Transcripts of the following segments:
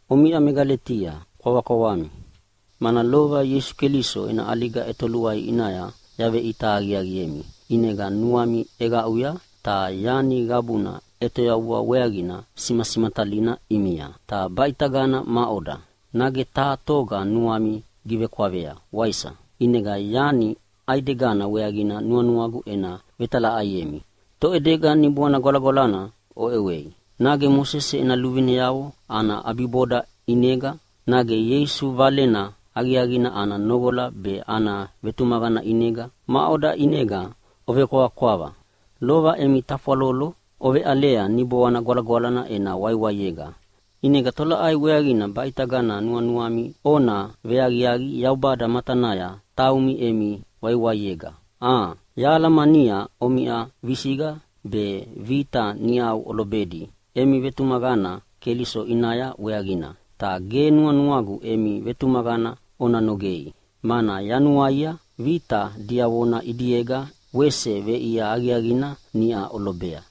Omiʼa me Galetia, kwavakwavami! Mana lova Ieisu Keliso ena ʼaliga ʼetoluai ʼinaya yaveʼita aqiaqiemi, ʼinega nuami ʼeqaʼuya ta yani qabuna ʼetoyavua weaqina simasimatalina ʼimia. Ta baʼitagana maʼoda? Nage taha toga nuami givekwavea, waisa? ʼInega yani ʼaidegana weaqina nuanuagu ena vetalaʼaiemi. Toʼedega Niboana Gwalagwalana oʼewei? Nage Mosese ena luvineavo ana ʼabiboda ʼinega? Nage Ieisu Valena Aqiaqina ana noqola be ana vetumaqana ʼinega? Maʼoda ʼinega ovekwavakwava? Lova emi tafwalolo oveʼalea Niboana Gwalagwalana ena waiwaiega, ʼinega tolaʼai weaqina baʼitagana nuanuami ona veaqiaqi Yaubada matanaya taumi emi waiwaiega, a? Yahalamania omiʼa visiqa be vita niʼau olobedi emi vetumaqana Keliso ʼinaya weaqina. Ta ge nuanuagu emi vetumaqana ona nogei, mana yanuaia vita diavona ʼidiega wese veʼia aqiaqina niʼa olobea!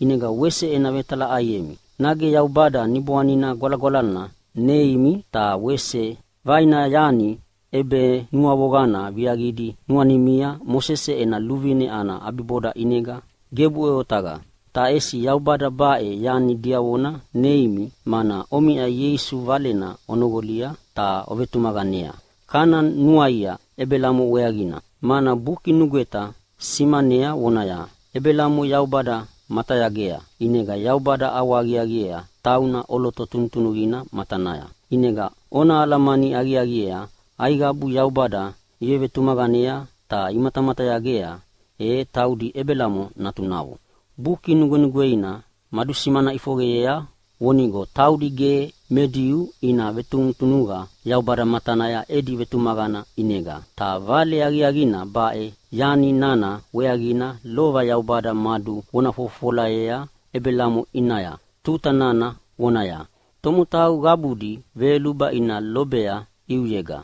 ʼInega wese ena vetalaʼaiemi, nage Yaubada Niboana Gwalagwalana neimi ta wese vaina yani ʼebenuavoqana viaqidi nuanimia Mosese ena luvine ana ʼabiboda ʼinega? Gebuʼe otaqa! Ta ʼesi Yaubada baʼe yani diavona neimi mana omiʼa Ieisu Valena onoqolia ta ovetumaqanea. Kana nuaia Ebelamo weaqina, mana Buki Nugweta simanea vonaya, “Ebelamo Yaubada matayagea, ʼinega Yaubada ʼawahaqiaqiea tauna ʼoloto tunutunuqina matanaya.” ʼInega ona alamani aqiaqiea aiqabu Yaubada ivevetumaqanea ta imatamatayagea, e taudi Ebelamo natunavo. Buki Nugwenugweina madusimana ʼifoqeyea vonigo taudi ge me Diu ina vetunutunuqa Yaubada matanaya edi vetumaqana ʼinega. Ta vale aqiaqina baʼe yani nana weaqina lova Yaubada maduvona fofofolayea Ebelamo ʼinaya tuta nana voneaya, “Tomotau qabudi veyoluba ina lobea ʼiuyega.”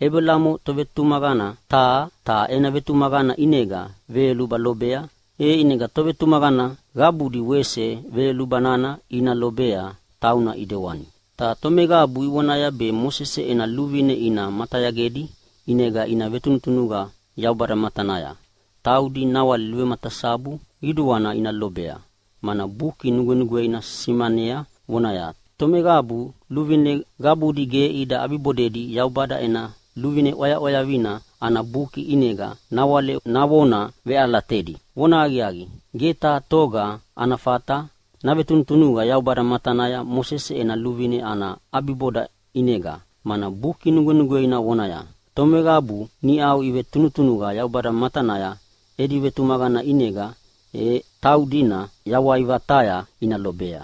Ebelamo tovetumaqana taha, ta ena vetumaqana ʼinega veyoluba lobea, e ʼinega tovetumaqana qabudi wese veyoluba nana ina lobea tauna ʼidewani. Ta tomeqabu ivonaya be Mosese ena luvine ina matayagedi ʼinega ina vetunutunuqa Yaubada matanaya, taudina nawale vematasabu qiduana ina lobea, mana Buki Nugwenugweina simanea vonaya, “Tomeqabu luvine qabudi ge ida ʼabibodedi Yaubada ena luvine ʼwayaʼwayavina ana Buki ʼinega nawale navona veʼalatedi.” Vonahaqiaqi, ge taha toga ana fata navetunutunuqa Yaubada matanaya Mosese ena luvine ana ʼabiboda ʼinega, mana Buki Nugwenugweina vonaya, “Tomeqabu niʼau ivetunutunuqa Yaubada matanaya edi vetumaqana ʼinega, e taudina yawai vataya ina lobea.”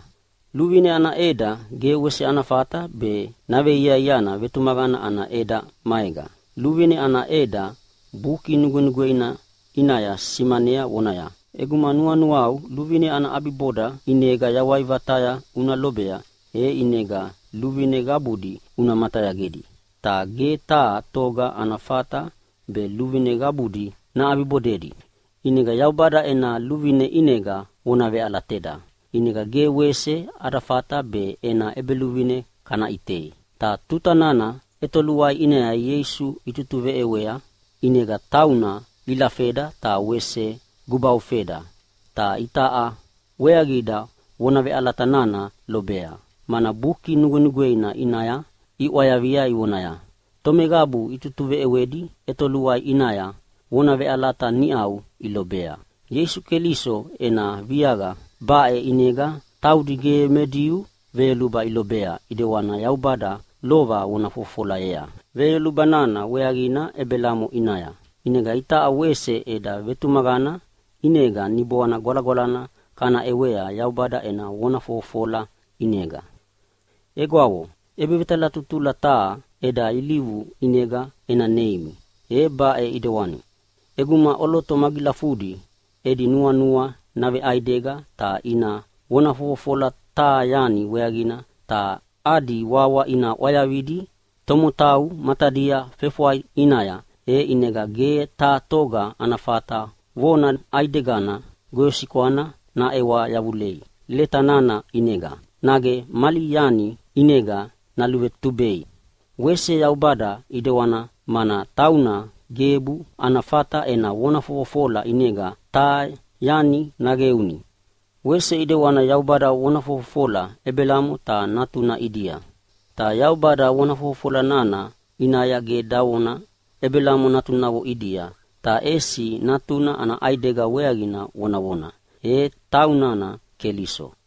Luvine ana ʼeda ge wese ana fata be naveiaiana vetumaqana ana ʼeda maega. Luvine ana ʼeda Buki Nugwenugweina ʼinaya simanea vonaya, “ʼEguma nuanuau luvine ana ʼabiboda ʼinega yawai vataya una lobea, e ʼinega luvine qabudi una matayagedi.” Ta ge taha toga ana fata be luvine qabudi naʼabibodedi. ʼInega Yaubada ena luvine ʼinega vona veʼalateda, ʼinega ge wese ada fata be ena ʼEbeluvine kana ʼitei. Ta tuta nana ʼetoluai ʼinaya Ieisu itutuveʼewea ʼinega tauna ilafeda ta wese gubaufeda, ta itaʼa weaqida vona veʼalata nana lobea, mana Buki Nugwenugweina ʼinaya iʼwayavia vonaya, “Tomeqabu itutuveʼewedi ʼetoluai ʼinaya vona veʼalata niʼa ilobea.” Ieisu Keliso ena viaqa baʼe ʼinega taudi ge me Diu veyoluba ilobea ʼidewani Yaubada lova vona fofofolayea veyoluba nana weaqina Ebelamo ʼinaya. ʼInega itaʼa wese eda vetumaqana ʼinega Niboana Gwalagwalana kana ʼewea Yaubada ena vona fofofola ʼinega. Egwavo, ʼebevetalatutula taha eda ilivu ʼinega ena neimi, e baʼe ʼidewani: ʼEguma ʼoloto magilafudi edi nuanua naveʼaidega ta ina vona fofofola taha yani weaqina ta adi wawa ina ʼwayavidi tomotau matadia fefwai ʼinaya, e ʼinega ge taha toga ana fata vona ʼaidegana goyosikwana naʼewa yavulei leta nana ʼinega, nage mali yani ʼinega naluvetubei. Wese Yaubada ʼidewana, mana tauna gebu ana fata ena vona fofofola ʼinega taha yani naqeuni. Wese ʼidewani Yaubada vona fofofola Ebelamo ta natuna ʼidia. Ta Yaubada vona fofofola nana ʼinaya ge davona, “Ebelamo natunavo ʼidia”, ta ʼesi natuna ana ʼaidega weaqina vonavona, e taunana Keliso.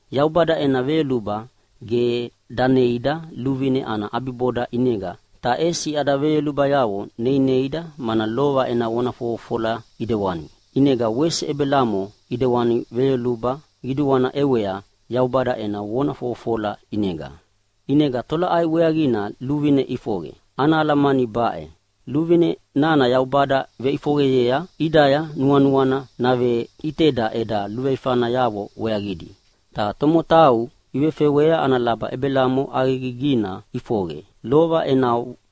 Yaubada ena veyoluba ge daneida luvine ana ʼabiboda ʼinega, ta ʼesi ada veyolubayavo neineida mana lova ena vona fofofola ʼidewani. ʼInega wese Ebelamo ʼidewani veyoluba qiduana ʼewea Yaubada ena vona fofofola ʼinega. ʼInega tolaʼai weaqina luvine ʼifoqe? Ana alamani baʼe: Luvine nana Yaubada veʼifoqeyea ʼidaya nuanuana naveʼiteda eda luveifanayavo weaqidi. Ta tomotau ivefewea ana laba Ebelamo ʼaqegigina ʼifoqe, lova ena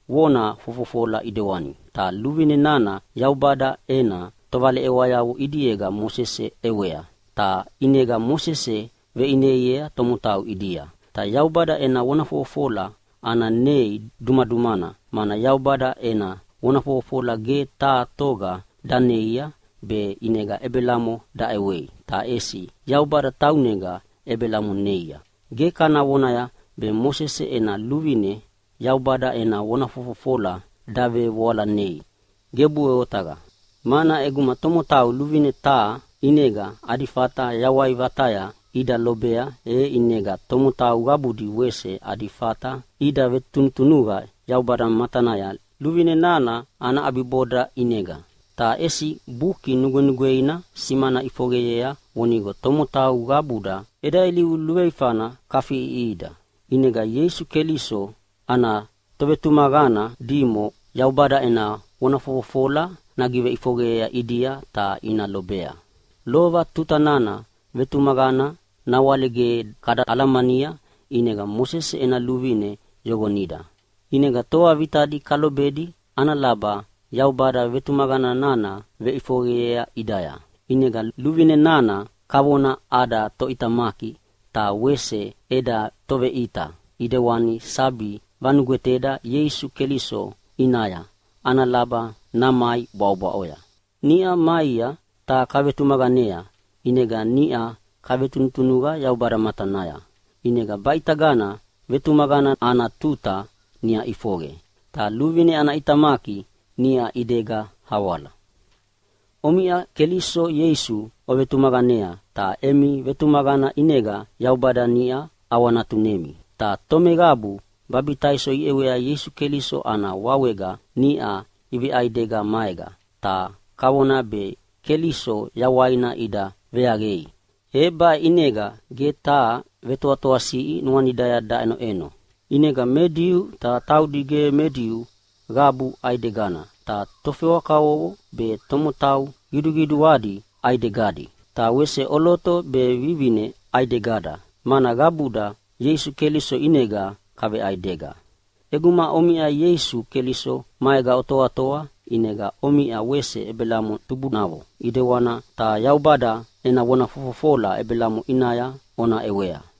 vona fofofola ʼidewani. Ta luvine nana Yaubada ena tovaleʼewayavo ʼidiega Mosese ʼewea, ta ʼinega Mosese veʼineiea tomotau ʼidia. Ta Yaubada ena vona fofofola ana nei dumadumana, mana Yaubada ena vona fofofola ge taha toga daneia be ʼinega Ebelamo daʼewei, ta ʼesi Yaubada taunega Ebelamo neia. Ge kana vonaya be Mosese ena luvine Yaubada ena vona fofofola davevoalanei. Gebuʼe otaqa! Mana ʼeguma tomotau luvine taha ʼinega adi fata yawai vataya ida lobea, e ʼinega tomotau qabudi wese adi fata ida vetunutunuqa Yaubada matanaya luvine nana ana ʼabiboda ʼinega. Ta ʼesi Buki Nugwenugweina simana ʼifoqeyea vonigo tomotau qabuda eda ilivu luveifana kafiʼiʼihida. ʼInega Ieisu Keliso ana tovetumaqana dimo Yaubada ena vona fofofola nagiveʼifoqeyea ʼidia ta ina lobea. Lova tuta nana vetumaqana nawale ge kada alamania ʼinega Mosese ena luvine yoqonida, ʼinega toa vitadi kalobedi ana laba Yaubada vetumaqana nana veʼifoqeyea ʼidaya. ʼInega luvine nana kavona ada toʼitamaki be wese eda toveʼita ʼidewana sabi vanugweteda Ieisu Keliso ʼinaya ana laba namai bwaʼobwaʼoya. Niʼa maia ta kavetumaqanea, ʼinega niʼa kavetunutunuqa Yaubada matanaya. ʼInega baʼitagana vetumaqana ana tuta niʼa ʼifoqe, ta luvine ana ʼitamaki niʼa ʼidega awala. Omiʼa Keliso Ieisu ovetumaqanea, ta emi vetumaqana ʼinega Yaubada niʼau ʼawanatunemi. Ta tomeqabu babitaiso iʼewea Ieisu Keliso ana wawega niʼa iveʼaidega maega, ta kavona be Keliso yawaina ida veaqei. E baʼe ʼinega ge taha vetoatoasiʼi nuanidaya daʼenoʼeno. ʼInega me Diu ta taudi ge me Diu qabu ʼaidegana, ta tofewa kavovo be tomotau qiduqiduadi ʼaidegadi, ta wese ʼoloto be vivine ʼaidegada, mana qabuda Ieisu Keliso ʼinega kaveʼaidega. ʼEguma omiʼa Ieisu Keliso maega otoatoa, ʼinega omiʼa wese Ebelamo tubunavo ʼidewana, ta Yaubada ena vona fofofola Ebelamo ʼinaya ona ʼewea.